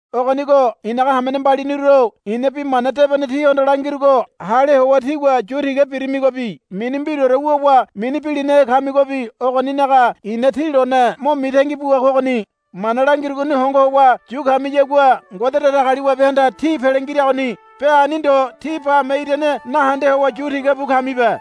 Ogonigo i̱naga hamene mbaliniru-o i̱na Bi Mana Debene tíhondo langirugo hale howa tígua yu tiga birimigobi mini mbiraore wuwa mini bilinahe kamigobi ogoninaga i̱na tí lone mo mitangi bua kogoni. Mana langirugoni hongo howa yu kamiyagua Ngode Datagaliwabehanda tí pele ngiragoni. Be ani ndo tí bame irane nahende howa yu tiga bu kamibe.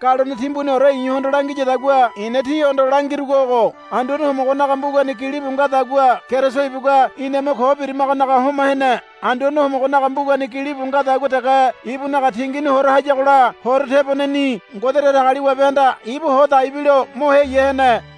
Galone timbuniore i̱hondo langiyadagua i̱na tíhondo langirugo ogo. Anduane Homogonaga mbugani gilibu ngadagua Keriso ibugua iname ko birimagonaga homa hene. Anduane Homogonaga mbugani gilibu ngadagua dege ibunaga tingini hora hayagola horo teboneni Ngode Datagaliwabehanda ibu ho dai bilo mo heya hene.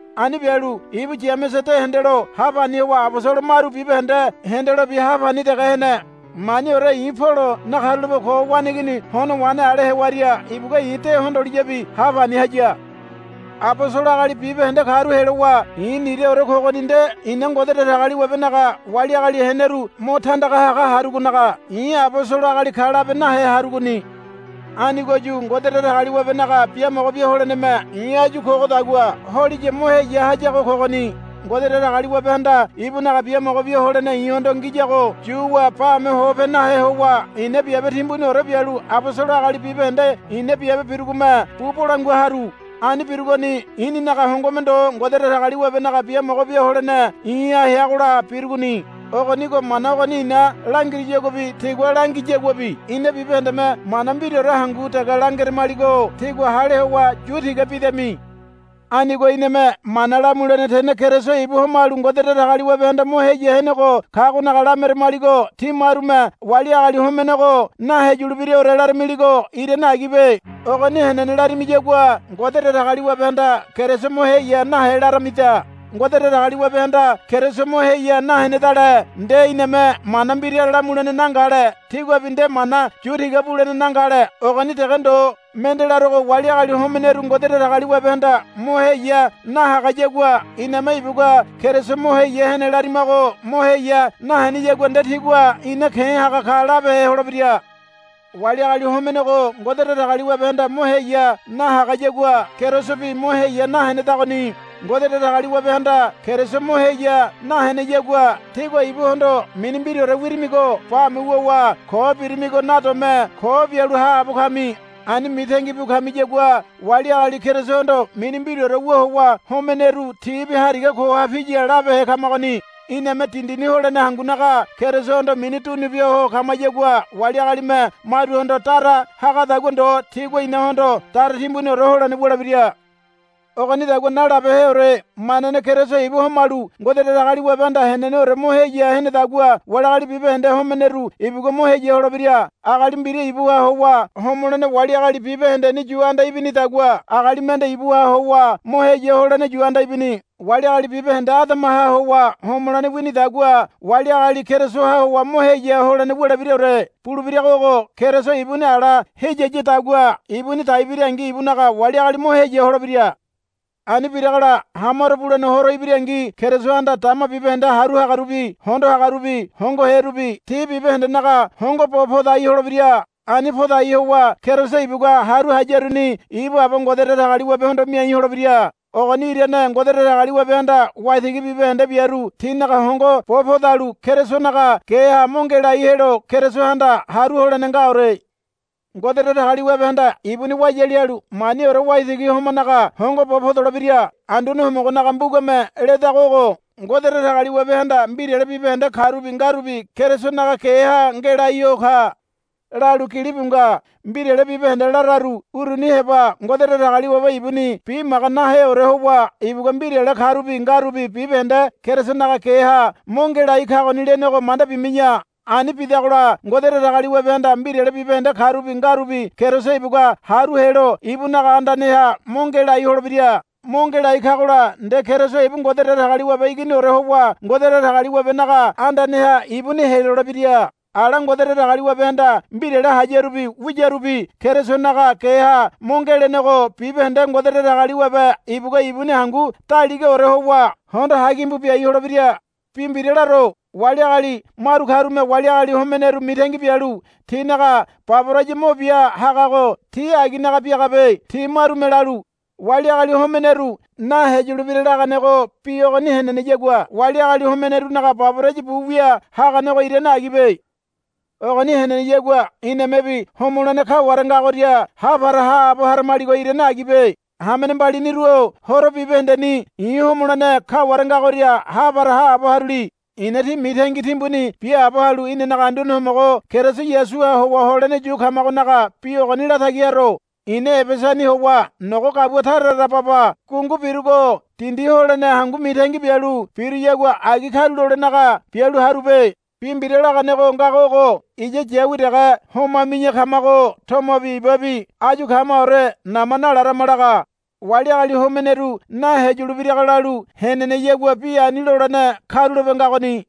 Ani bialu ibu Yamese de hendelo ha pani howa abosolo maru bibahende hendelobi ha pani dege hene. Maniore i̱ Polo nakarulape ko waneigini hono wahene ale hewaria ibugua i̱ de hondoliyabi ha pani haya. Abosolo agali bibahende karu helowa i̱ niraore kogoni nde i̱na Ngode Datagaliwabenaga wali agali heneru mo tandaga haga harugonaga i̱ abosolo agali ka labe nahe harugoni. Anigoyu Ngode Datagaliwabenaga biamogo bia holeneme i̱ áyu kogodagua holiya mo heya hayago kogoni. Ngode Datagaliwabehanda ibunaga biamogo bia holene i̱hondo ngiyago yuwa bame hope nahe howa i̱na biabe timbuniore bialu abosolo agali bibahende i̱na biabe birugome bu bolangua haru. Ani birugoni i̱ninaga hongome ndo Ngode Datagaliwabenaga biamogo bia holene i̱ha heagola birugoni. Ogonigo mana ogoni i̱na langiruyaguabi tigua langiyaguabi ina bibahendeme mana mbiraore hangu dege langeramaligo tígua hale howa yu tiga bidami. Anigo iname mana lamulene tene Keriso ibu homalu Ngode Datagaliwabehanda mo heya henego kagonaga lameramaligo tí marume wali agali homenego naheyulebiraore laramiligo irane agibe. Ogoni henene larimiyagua Ngode Datagaliwabehanda Keriso mo heya nahe laramida. Ngode Datagaliwabehanda Keriso mo heya nahenedale nde iname mana mbira lamulene nangale. Tíguabi nde mana yu tiga bulene nangale. Ogoni dege ndo. Mende larogo wali agali homeneru Ngode Datagaliwabehanda mo heya nahagayagua iname ibugua Keriso mo heya hene larimago mo heya naheneyagua nde tigua ina ke̱ haga ka labehe holebira. Wali agali homenego Ngode Datagaliwabehanda mo heya nahagayagua Kerisobi mo heya nahenedagoni. Ngode Datagaliwabehanda Keriso mo heya naheneyagua tígua ibuhondo mini mbiraore wirimigo bame wuwa ko birimigo nadome ko bialu haabo kami. Ani mitangi bu kamiyagua wali agali Kerisohondo mini mbiraore wu howa homeneru tibi hariga koha piya labehe kamagoni. Iname dindini holene hangunaga Kerisohondo mini dunu bia ho kamayagua wali agalime maruhondo dara hagadagua ndo tigua inahondo dara timbuniore holene wulebira. Ogonidagua nalabeheore. Manane Keriso ibu homalu Ngode Datagaliwabehanda heneneore mo heya henedagua wali agali bibahende homeneru ibugua mo heya holebira. Agali mbira ibuha howa homolene wali agali bibahendeni yu anda ibinidagua agali mende ibuha howa mo heya holene yu anda ibini. Wali agali bibahende Adamaha howa homolene winidagua wali agali Kerisoha howa mo heya holene wulebiraore. Bulebirago ogo. Keriso ibuni ala heyiyadagua ibuni dai birangi ibunaga wali agali mo heya holebira. Ani biragola hamaro bulene horo ibirangi Kerisohanda dama bibahende haru hagarubi hondo hagarubi hongoherubi ti bibahendenaga hongo bo podai holebira. Ani podai howa Keriso ibugua haru hayaruni ibu Aba Ngode Datagaliwabehondo miai holebira. Ogoni irane Ngode Datagaliwabehanda waitigi bibahende biaru tinaga hongo bo podalu Kerisonaga geha mo ngelai helo Kerisohanda haru holene ngaore. Ngode Datagaliwabehanda ibuni wayali halu maniore waitigi homanaga hongo bo podolebira. Anduane Homogonaga mbugame ledago ogo. Ngode Datagaliwabehanda mbirale bibahende karubi ngarubi Kerisonaga geha ngelai ho ka, lalu gilibu nga. Mbirale bibahende lararu uruni heba Ngode Datagaliwabe ibuni bimaga naheore howa ibugua mbirale karubi ngarubi bibahende Kerisonaga geha mo ngelai kagoni lenego manda bimi̱ya. Ani bidagola Ngode Datagaliwabehanda mbirale bibahende karubi ngarubi Keriso ibugua haru helo ibunaga andaneha mo ngelai holebira. Mo ngelai kagola nde Keriso ibu Ngode Datagaliwabe Iginiore howa Ngode Datagaliwabenaga andaneha ibuni helolebira. Ala Ngode Datagaliwabehanda mbirale hayarubi wiyarubi Kerisonaga geha mo ngelenego bibahende Ngode Datagaliwabe ibugua ibuni hangu daligaore howa hondo hagimbu biai holebira. Bi mbira laro. Wali agali maru karume wali agali homeneru mitangi bialu tinaga baboraya mo bia hagago ti aginaga biagabe. Ti marume lalu, Wali agali homeneru naheyulebira, laganego bi ogoni heneneyagua wali agali homenerunaga baboraya bu wia haganego irane agibe. Ogoni heneneyagua inamebi homolene kaware ngagoria ha para haabo haramaligo irane agibe. Hamene mbaliniru-o horo bibahendeni i̱ homolene kaware ngagoria ha para haabo haruli. I̱na tí mitangi timbuni biaabo halu inanaga Anduane Homogo Keriso Yasuha howa holene yu kamagonaga bi ogoni latagi haro. I̱na Ebesani howa nogo gabua tara tara baba gungu birugo dindi holene hangu mitangi bialu biruyagua agi karulolenaga bialu harube. Bi mbira laganego ngago ogo, Iya yawi dege homami̱ya kamago tomobi ibabi áyu kamaore nama nalarama, laga. Wali agali homeneru naheyulebirago lalu heneneyagua bi ani lolene karulape ngagoni.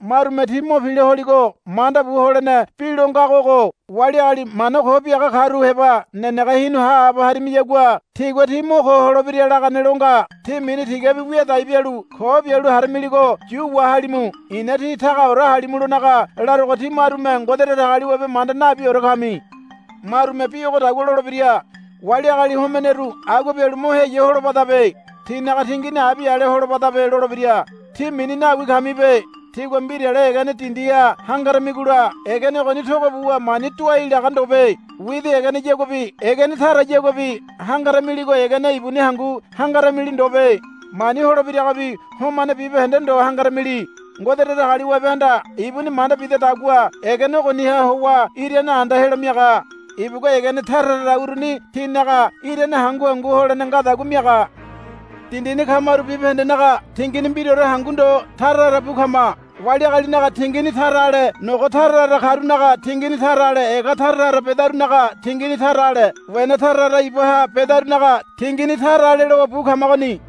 Marume tí mo pila holigo manda bu holene bi lo ngago ogo. Wali agali mana ko biaga karu heba nenege hinu haabo harimiyagua tigua tí mo ko holebira, lagane lo nga. Tí mini tigabi wiadai bialu ko bialu haramiligo yu wahalimu. I̱na tí tagaore halimulonaga larogo tí marume Ngode Datagaliwabe manda nabiore kami. Marume bi ogodagua lolebira, Wali agali homeneru agua bialu mo heya holobadabe. Tinaga tingini abi ale holobadabe, lolebira. Tí mini nawi kamibe. Tígua mbirale egene dindiha hangaramigola egene ogoni togo buwa mani doai laga ndobe. Widi egeneyaguabi egene tarayaguabi hangaramiligo egene ibuni hangu hangaramili ndobe. Mani holebiragobi homane bibahende ndo hangarimi. Ngode Datagaliwabehanda ibuni manda bidadagua egene ogoniha howa irane anda helo miaga. Ibugua egene tara tara uruni tinaga irane hangu hangu holene ngadagua miaga. Dindini kamaru bibahendenaga tingini mbiraore hangu ndo tara tara bu kama. Wali agalinaga tingini tara ale nogo tara tara karunaga tingini tara ale ega tara tara bedarunaga tingini tara ale wena tara tara ibaha bedarunaga tingini tara ale lowa bu kamagoni.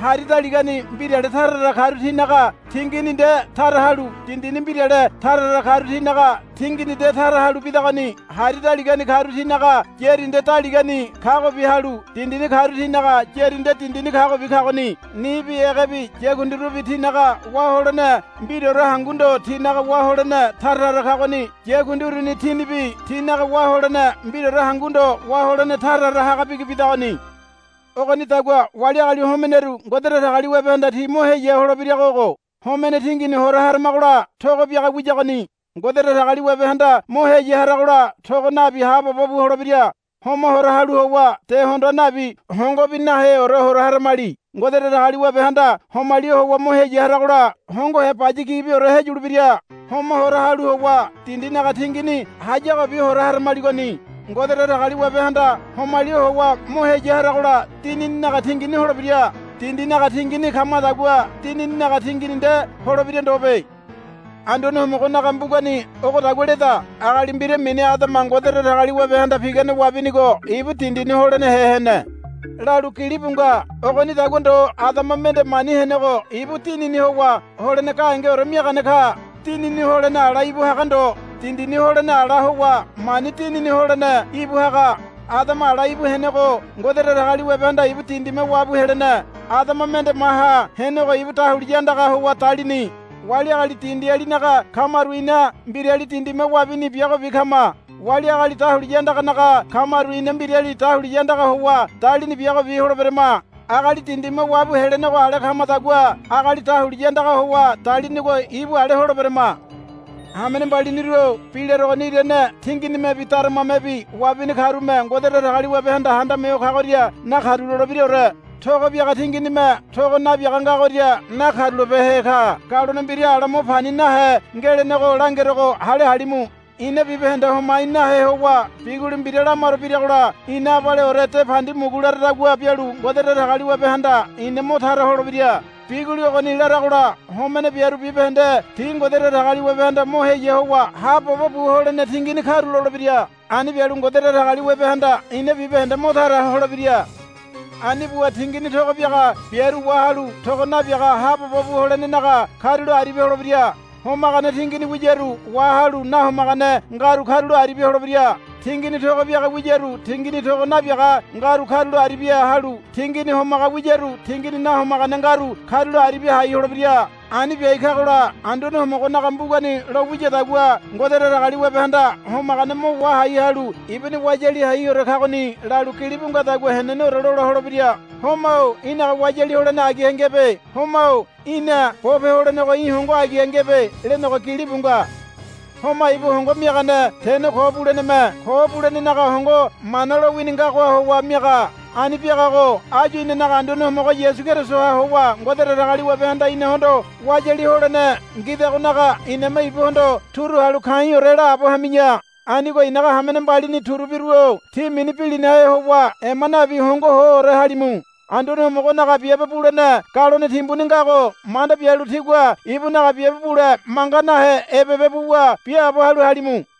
Hari daligani mbirale tara tara karu tinaga tingini nde tara halu dindini mbirale tara tara karu tinaga tingini nde tara halu bidagoni. Hari daligani karu tinaga yári nde daligani kagobi halu dindini karu tinaga yári nde dindini kagobi kagoni. Nibi egebi yakundirubi tinaga wá holene mbiraore hangu ndo tínaga wá holene tara tara kagoni. Yakundi uruni tinibi tinaga wá holene mbiraore hangu ndo wá holene tara tara haga bigi bidagoni. Ogonidagua wali agali homeneru Ngode Datagaliwabehanda ti mo heya holebirago ogo. Homene tingini hora haramagola togo biaga wiyagoni. Ngode Datagaliwabehanda mo heya haragola togo nabi haabobo bu holebira. Homa hora halu howa de hondoa nabi hongobi naheore hora haramali. Ngode Datagaliwabehanda homali howa mo heya haragola hongohe baya gibiore heyulebira. Homa hora halu howa dindinaga tingini hayagobi hora haramaligoni. Ngode Datagaliwabehanda homali howa mo heya haragola dinininaga tingini holebira. Dindinaga tingini kamadagua dinininaga tingini nde holebira ndobe. Anduane Homogonaga mbugani ogodagua leda, Agali mbira mini Adama Ngode Datagaliwabehanda pigane wabinigo ibu dindini holenehe hene, lalu gilibu nga. Ogonidagua ndo Adama mende mani henego ibu Dinini howa holene gahengeore miagane ka. Dinini holene ala íbu haga ndo. Dindini holene ala howa mani dinini holene íbu haga. Adama ala íbu henego Ngode Datagaliwabehanda ibu dindime wabu helene. Adama mende maha henego ibu dahuliya andaga howa dalini. Wali agali dindialinaga kamaru ina mbirali dindime wabini biagobi kama. Wali agali dahuliya andaganaga kamaru ina mbirali dahuliya andaga howa dalini biagobi holeberema. Agali dindime wabu helenego ale kamadagua agali dahuliya andaga howa dalinigo ibu ale holeberama. Hamene mbaliniru-o bi larogoni irane tinginimebi daramamebi wabini karume Ngode Datagaliwabehanda Handame Ho Kagoria nakarulolebiraore. Togo biaga tinginime togo nabiaga ngagoria nakarulabehe ka. Galone mbira ala mo pani nahe ngelenego langerogo hale halimu. Ina bibahende homai nahe howa biguli mbira lamaro biragola ina abaleore de pandi mugu laradagua bialu Ngode Datagaliwabehanda ina mo tara holebira. Biguli ogoni laragola homene biaru bibahende ti Ngode Datagaliwabehanda mo heya howa haabobo bu holene tingini karulolebira. Ani bialu Ngode Datagaliwabehanda ina bibahende mo tara holebira. Ani buwa tingini togo biaga biaru wahalu togo nabiaga haabobo bu holenenaga karulo aribia holebira. Homagane tingini wiyaru wahalu nahomagane ngaru karulo aribia holebira. Tingini togo biaga wiyaru tingini togo nabiaga ngaru karulo aribia halu tingini homaga wiyaru tingini nahomagane ngaru karulo aribia hai holebira. Ani biai kagola Anduane Homogonaga mbugani lo wiyadagua, Ngode Datagaliwabehanda homagane mo wahai halu ibuni wayali haiore kagoni, lalu gilibu ngadagua heneneore lola holebira. Homa-o í̠naga wayali holene agiha ngebe. Homa-o í̠na bope holenego í̠ hongo agiha ngebe, lenego gilibu nga. Homa ibu hongo miagane tene ko buleneme. Ko bulenenaga hongo Mana lowini ngagoha howa miaga. Ani biagago áyu inanaga Anduane Homogo Yasu Kerisoha howa Ngode Datagaliwabehanda inahondo wayali holene ngidagonaga iname ibuhondo turu halu ka̱i̱ore laabo hami̱ya. Anigo i̱naga hamene mbalini turubiru-o tí mini bilinahe howa ema nabi hongo hoore halimu. Anduane Homogonaga biabe bulene galone timbuni ngago manda bialu tígua ibunaga biabe bule manga nahe ebebe buwa biaabo halu halimu.